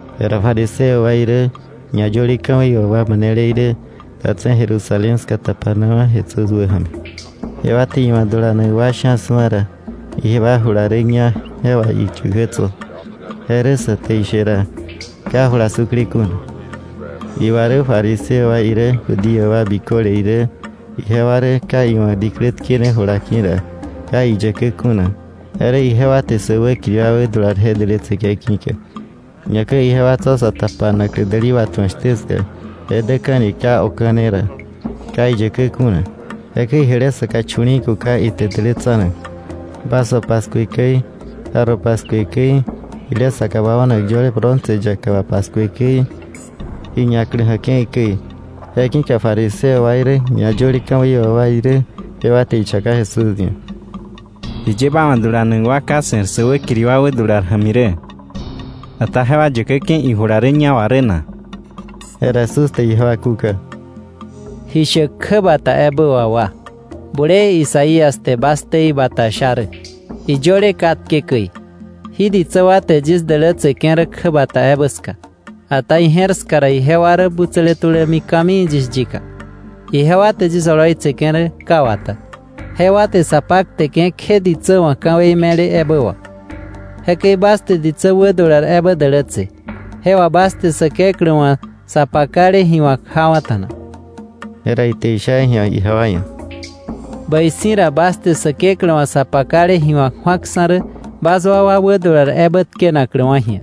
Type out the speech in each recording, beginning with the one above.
Jera fariseo wa irä, ñayöle ka̱wei wà wa manele irä, datse̱ Jerusalén ska tapanawa̱ Jesús wäja̱mi. Jewa te iwa̱ dulanak wa sha̱ su̱a ra, ijewa jula rä ñá je wà iyäkä tso̱; je rä sä te ishe ra, ka jula sukle kuna. (Iwa rä fariseo wa irä Judío wa biköle irä, jewa rä ka iwa̱ diklä tkene ijula ki̱ ra, ka iyäkä kuna; je rä ijewa te sä wäkiri wa wädular je dälätseke̱ ki̱ka. Ñakäi ijewa tso̱ sa tapanaklä däli watju̱ak shtä ska je däke̱ni ka oka̱ne ra, ka iyäkä kuna. Jekäi jile saka chu̱li̱i̱ kuka ite dälätsanak, vaso paskue käi, jarro paskue käi, jile saka wao̱nak yöle bronce yaka wà paskue käi, ji ñaklä ja̱ke̱i käi.) Je ki̱ka fariseo wa irä ñayöle ka̱wei wà wa irä, jewa te ichaka Jesús ia̱: —¿Jiye ba wa̱ dulanak wa ka se̱r sä wäkiri wa wädular ja̱mi rä, ata jewa yäkäke̱ ijula rä ñá wa rä na? Jera Jesús te ijewa kúka: —¡Ji shäk kjäbata ebä wà wa! Bulee Isaías te bas ktei bata sha rä, iyöle katke käi: ‘Jí ditsä wa te yis dälätseke̱ rä kjäbata ebä ska, ata ije̱r ska ra ijewa rä butsäle tulämi ka̱mii yis yika. Ijewa te yis oloitseke̱ rä ka wata. Jewa te sa pakteke̱ kje ditsä wa̱ ka̱wei me̱le ebä wà.’ Jekäi bas te ditsä wädular ebä dälätse, jewa bas te Säkeklä wa̱ sa pakale ji wa̱k jawa̱ta̱na. Jera ite isha ji̱a ijewa ia̱: —Bäi si̱ ra bas te Säkeklä wa̱ sa pakale ji wa̱k ju̱aksa̱ rä bas wakwa wädular ebä tkenakläwa̱ ji̱a.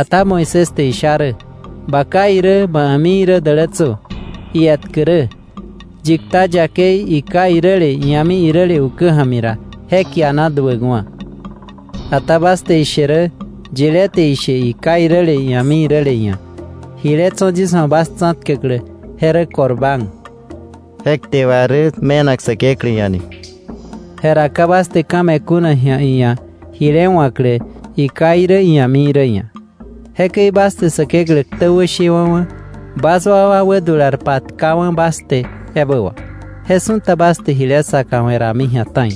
Ata Moisés te isha rä: ‘Ba ká irä ma a̱mi irä dälätsö’, ietkä rä: ‘Yi kta yakei iká iräle, ia̱mi iräle ukä ja̱mi ra, je kiana duäkwa̱.’ Ata bas te ishe rä: ‘Yilé te ishe iká iräle ia̱mi iräle ia̱: “Jile tso̱ yis wa̱ bas tsa̱tkäklä je rä Corbán” ’ (je kte wà rä: me̱nak Säkeklä ia̱); jera ka bas te ka̱ me̱ kuna ji̱a iia̱ jile wa̱klä iká irä ia̱mi irä ia̱. Jekäi bas te Säkeklä ktä wäshewa̱wa̱ bas wakwa wädular patkawa̱ bas te ebä wà. Je su̱ta bas te jile saka we̱ rami ta̱i.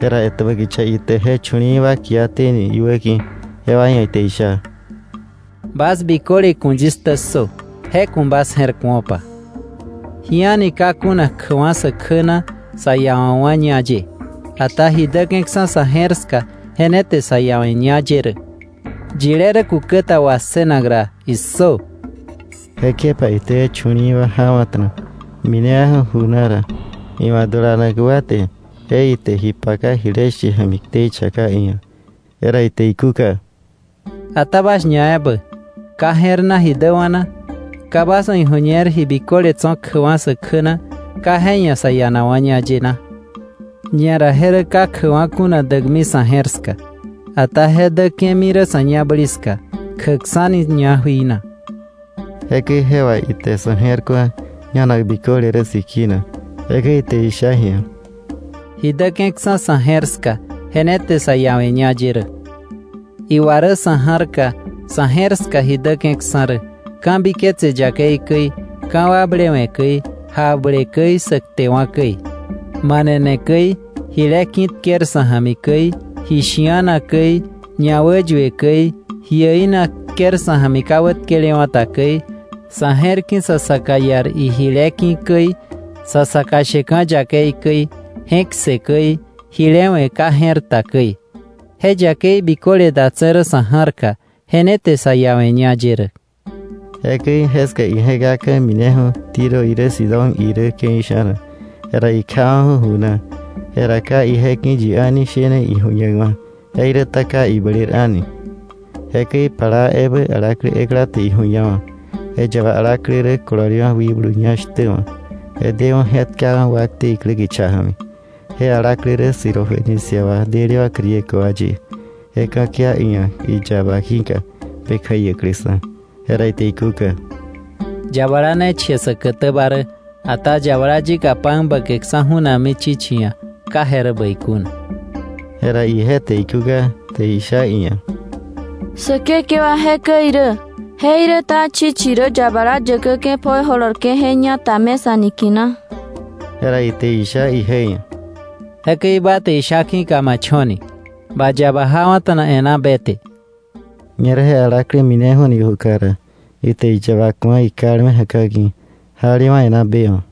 Jera etäbä kicha ite je chu̱li̱i̱ wa kiaté ni iwäki̱, jewa ia̱ ite isha: —Bas biköle ku̱ yis ktä ssö, je ku̱ bas je̱r ku̱opa: Ji a̱ni ka kuna kjäkwa̱ sä kjä na sa iawa̱kwa̱ ñá ye, ata ji däke̱ksa̱ sa̱ je̱r ska je ne te sa iawe̱ ñá ye rä. ¡Yile rä kukäta wassënak ra, issö!” Jekjepa ite je chu̱li̱i̱ wa jawa̱ta̱na minewa̱ju̱ ju na ra, iwa̱ dulanak wa te je ite ji paka jile she ja̱mi ktei chaka iia̱. Jera ite ikúka: —¿Ata bas ñaebä, ka je̱r na ji däwa̱ na? ¿Ka bas wa̱ iju̱ñer ji biköle tso̱ kjäkwa̱ sä kjä na ka je ia̱ sa ianakwa̱ ñá ye na? Ñera je rä ka kjäkwa̱ kuna däkmi sa̱ je̱r ska, ata je däke̱mi rä sa̱ ñabäli ska, kjäkksa̱ni ñá jui na. Jekäi je wà ite sa̱ je̱r ku̱a ñanak biköle rä sikina. Jekäi ite isha ji̱a: —Ji däke̱ksa̱ sa̱ je̱r ska je ne te sa iawe̱ ñá ye rä. Iwa rä sa̱ ja̱rka, sa̱ je̱r ska ji däke̱ksa̱ rä: ka̱biketse yakei käi, ka̱wakblewe̱ käi, jakble käi, sä ktewa̱ käi, manene käi, jile ki̱tker sa̱ ja̱mi käi, ji shi̱ana käi, ñawäyue käi, ji äina tker sa̱ ja̱mi ka wätkelewa̱ ta käi, sa̱ je̱r ki̱ sa saka iar ijile ki̱ käi, sa saka sheka̱ yakei käi, je̱k ssë käi, jile we̱ ka je̱r ta käi. Je yakei biköle datse̱ rä sa̱ ja̱rka, je ne te sa iawe̱ ñá ye rä. Jekäi jeska ije̱kaka̱ mineju̱ Tiro irä Sidón irä ke̱i sha̱na, jera ikjawa̱ju̱ ju na. Jera ka ije ki̱ yi a̱ni shene ijuñakwa̱, jeiräta ka ibler a̱ni. Jekäi plaa ebä alaklä ekla te iju̱ñawa̱. Je yaba alaklä rä kololewa̱ wikblu ñá shtä wa̱. Je deju̱ je̱tkawa̱ wakte iklä kicha ja̱mi. Je alaklä rä Sirofenicia wa delewa̱ Griego wa ye, je ka̱kia iia̱ iwa̱ iyaba ki̱ka be kjäiäkläksa̱. Jera ite ikúka: —Yabala ne che säkätäba rä. Ata yabala yika pan bäkeksa̱ ju̱nakmi chichi ia̱, ka je rä bäi kuna. Jera ije te ikúka te isha iia̱: —Säkekewa jekäi irä. Jeiräta chichi rä yabala yäkäke̱ pjoi jolorke̱ je ñata mesa niki̱na. Jera ite isha ije ia̱: —Jekäi ba te isha ki̱ka ma cho̱ni, ba yaba jawa̱ta̱na e̱ná be te. Ñerä je alaklä mineju̱ni ijuka ra, ite iyaba ku̱a ikalme ja̱ka̱ ki̱, jalewa̱ e̱ná be wa̱.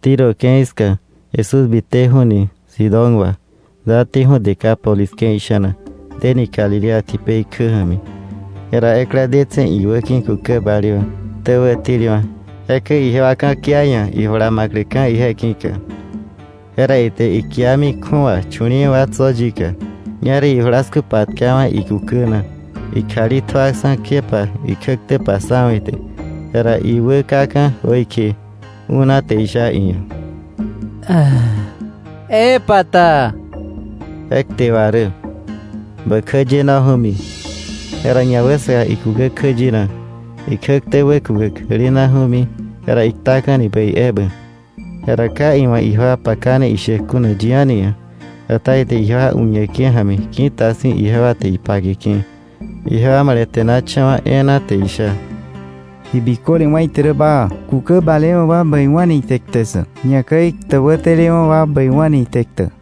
Tiro ke̱i ska Jesús biteju̱ni Sidón wa, dáteju̱ Decápolis ke̱i sha̱na, deni Galilea tipei kjä ja̱mi. Jera ekla detse̱ iwäki̱ kukä balewa̱, ktä wätelewa̱. Jekäi ijewa ka̱kia iia̱, ijula ma̱kläka̱ ije ki̱ka. Jera ite ikiami kju̱awa chu̱li̱i̱ wa tso̱ yika. Ñerä ijulasku patkawa̱ ikukä na, ikjali tjuaksa̱ kjepa ikjäktä passawa̱ ite. Jera iwä kaka̱ jöikje, ú̱na te isha iia̱: “¡Epata!” (Je kte wà rä: “¡Bä kjäyenoju̱mi!”) Jera ñawäsaka ikukä kjäyena, ikjäktä wäkukäk jälena tulami, jera iktaka̱ni bäi ebä. Jera ka iwa̱ ijewa pakane ishäk kuna yi a̱ni ia̱, ata ite ijewa uñeke̱ ja̱mi ki̱ta si̱ ijewa te ipakeke̱. Ijewa male̱te̱nacha̱wa̱ e̱e̱na te isha: “Ji biköle wá̱ ite rä baa. Kukä balewa̱ wa bäiwa̱ni ite kte ssäk, ñakäi ktä wätelewa̱ wa bäiwa̱ni ite ktäk!”